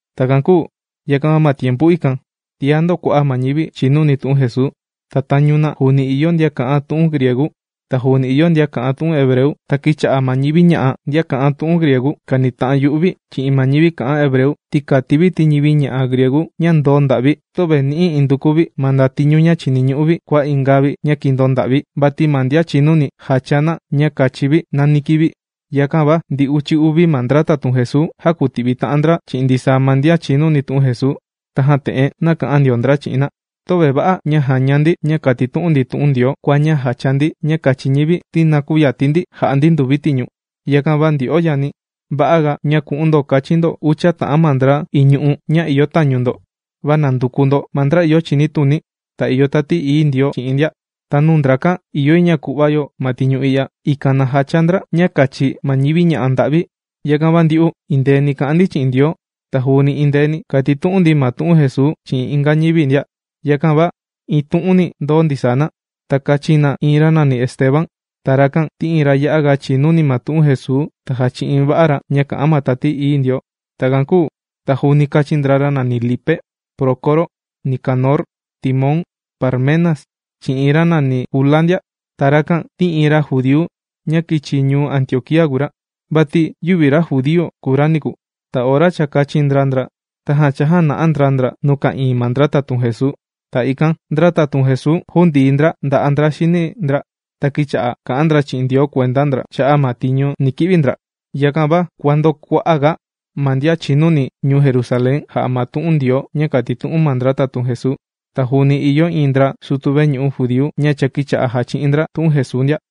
Takan kūu yakan va ma tiempu ikan, tiá ndōkua'a' ma ñivi chìnuni tu'un Jesuu. Ta tañu na, juuni ìyo ndian kà'an tu'un griegu, ta juuni ìyo ndian kà'an tu'un hebreu. Ta kīcha'a ma ñivi ña'a, ndian kà'an tu'un griegu kànita'an yu'u vi chi'in ma ñivi kà'an hebreu, ti kàti vi ti ñivi ña'a griegu ña ndōo nda'vi, töve nì'i induku vi ma ndatiñu ña chìniñu'u vi kua inga vi ña kīndoo nda'vi. Vati ma ndian chìnuni jàchaa na ña kachi vi nani kivi. Yakan va ndi uchi uvi ma ndra tatun Jesuu, jākuti'vi ta'an ndra chi'in ndisaa ma ndian chìnuni tu'un Jesuu, tajan te'en nāka'an ndio ndra chi'in na: ―Töve va'a ña jàña ndi ña kàtitu'un ndi tu'un Ndioo, kua ña jacha ndi ña kachi ñivi ti na küyati ndi ja'a ndi nduvi tiñu. Yakan va ndyo'o yani, ¡va'aga ña ku'un ndo kachin ndo ucha ta'an ma ndra iñu'u ña ìyo tañu ndo! Va nanduku ndo ma ndra ìyo chinituni, ta ìyo Tati Ií Ndioo chi'in ndia. Ta nuu ndrakan ìyo yi ña ku'va yo ma tiñu i'ya, ikan na jacha ndra ña kachi ma ñivi ña'a nda'vi. Yakan va ndyu'u, endeeni kà'an ndi chi'in Ndioo, ta juuni endeeni kàtitu'un ndi ma tu'un Jesuu chi'in inga ñivi ndia. Yakan va iin tu'uni ndōo ndisaa na. Ta kāchin na iin ra nàni Esteban. Ta rakan ti iin ra ya'a ga chìnuni ma tu'un Jesuu ta jàchi'in va'a ra ña kà'an ma Tati Ií Ndioo. Takan kūu ta juuni kāchin ndra ra nàni Lipe, Prócoro, Nicanor, Timón, Parmenas chi'in iin ra nàni Kula ndia. Ta rakan ti iin ra judíu ña kīchi ñuu Antioquía kùu ra. Vati yüvi ra judíu kùu ra niku. Ta ora cha kāchin ndra ndra, tajan chājana'a ndra ndra nuu ka'ìin ma ndra tatun Jesuu. Ta ikan ndra tatun Jesuu jūndii ndra nda'a' ndra xini ndra, ta kīcha'a kà'an ndra chi'in Ndioo kuenda ndra cha'a' ma tiñu ni ki'vi ndra. Yakan va kuàndokua'aga ma ndian chìnuni ñuu Jerusalén jà'a ma tu'un Ndioo ña kàtitu'un ma ndra tatun Jesuu. Ta juuni ìyo iin ndra sutu veñu'u judíu ña cha kīcha'a jàchi'in ndra tu'un Jesuu ndia.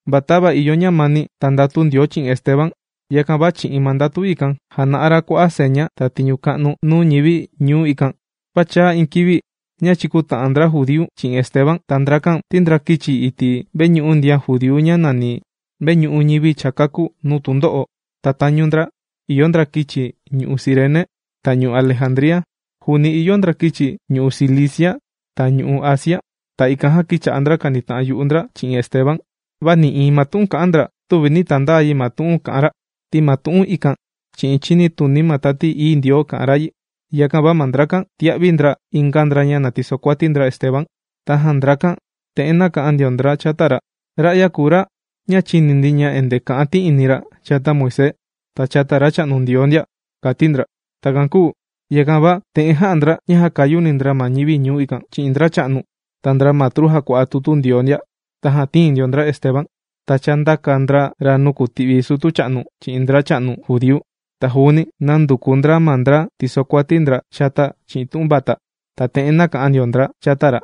Va tava ìyo ñamani, ta ndatu Ndioo chi'in Esteban, yakan va chi'in ma ndatu ikan, jàna'a ra kua'a' seña ta tiñu ka'nu nuu ñivi ñuu ikan. Va chāa iin kivi ña chīkuta'an ndra judíu chi'in Esteban. Ta ndrakan ti ndra kīchi iti' veñu'u ndian judíu ña nàni: Veñu'u Ñivi Cha Kākú Nuu Tundo'o. Ta tañu ndra ìyo ndra kīchi ñu'u' Cirene, ta ñu'u' Alejandría. Juuni ìyo ndra kīchi ñu'u' Cilicia ta ñu'u' Asia. Ta ikan jan kīcha'a ndra kànita'an yu'u ndra chi'in Esteban. Va nï'iin ma tu'un kà'an ndra, tüvi nī tandaa yi ma tu'un kà'an ra. Ti ma tu'un ikan chi'in chinituni ma Tati Ií Ndioo kà'an ra yi. Yakan va ma ndrakan, tīa'vi ndra inga ndra ña na tisokuati ndra Esteban. Tajan ndrakan te'en nāka'an ndio ndra chata ra: ―Ra'ya kùu ra ña chīni ndi ña endee kà'an ti'ini chata Moisés ta chata Racha'nu Ndioo ndia ―kàti ndra. Takan kūu yakan va, te'en jā'a ndra ña jākayuni ndra ma ñivi ñuu ikan, chi'in ndracha'nu, ta ndra matru jàkua'a tutu Ndioo ndia. Tajan tīin ndio ndra Esteban, ta chāndaka ndra ra nuu kùti'vi sutu cha'nu chi'in ndracha'nu judíu. Ta juuni nānduku ndra ma ndra tìsokuati ndra chata chi'in tu'un vata. Tajan te'en nāka'an ndio ndra chata ra: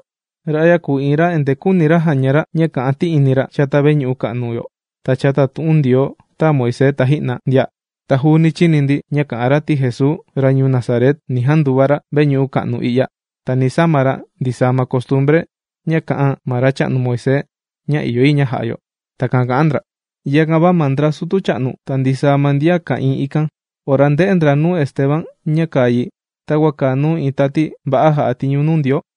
―Ra'ya kùu iin ra endee küuni jaña ra ña kà'an ti'ini chata veñu'u ka'nu yo ta chata tu'un Ndioo tāa Moisés taji'na ndia. Ta juuni chīni ndi ña kà'an ra ti Jesuu, ra ñuu Nazaret, ni janduva ra veñu'u ka'nu i'ya, ta ni sama ra ndisaa ma costumbre ña kā'an ma racha'nu Moisés, ña ìyo yi ña ja'a yo. ―Takan kà'an ndra. Yakan va ma ndra sutu cha'nu, ta ndisaa ma ndian ka'ìin ikan, ora ndē'e ndra nuu Esteban ña kàa yi takua kàa nuu iin tati va'a jà'a tiñu nuu Ndioo.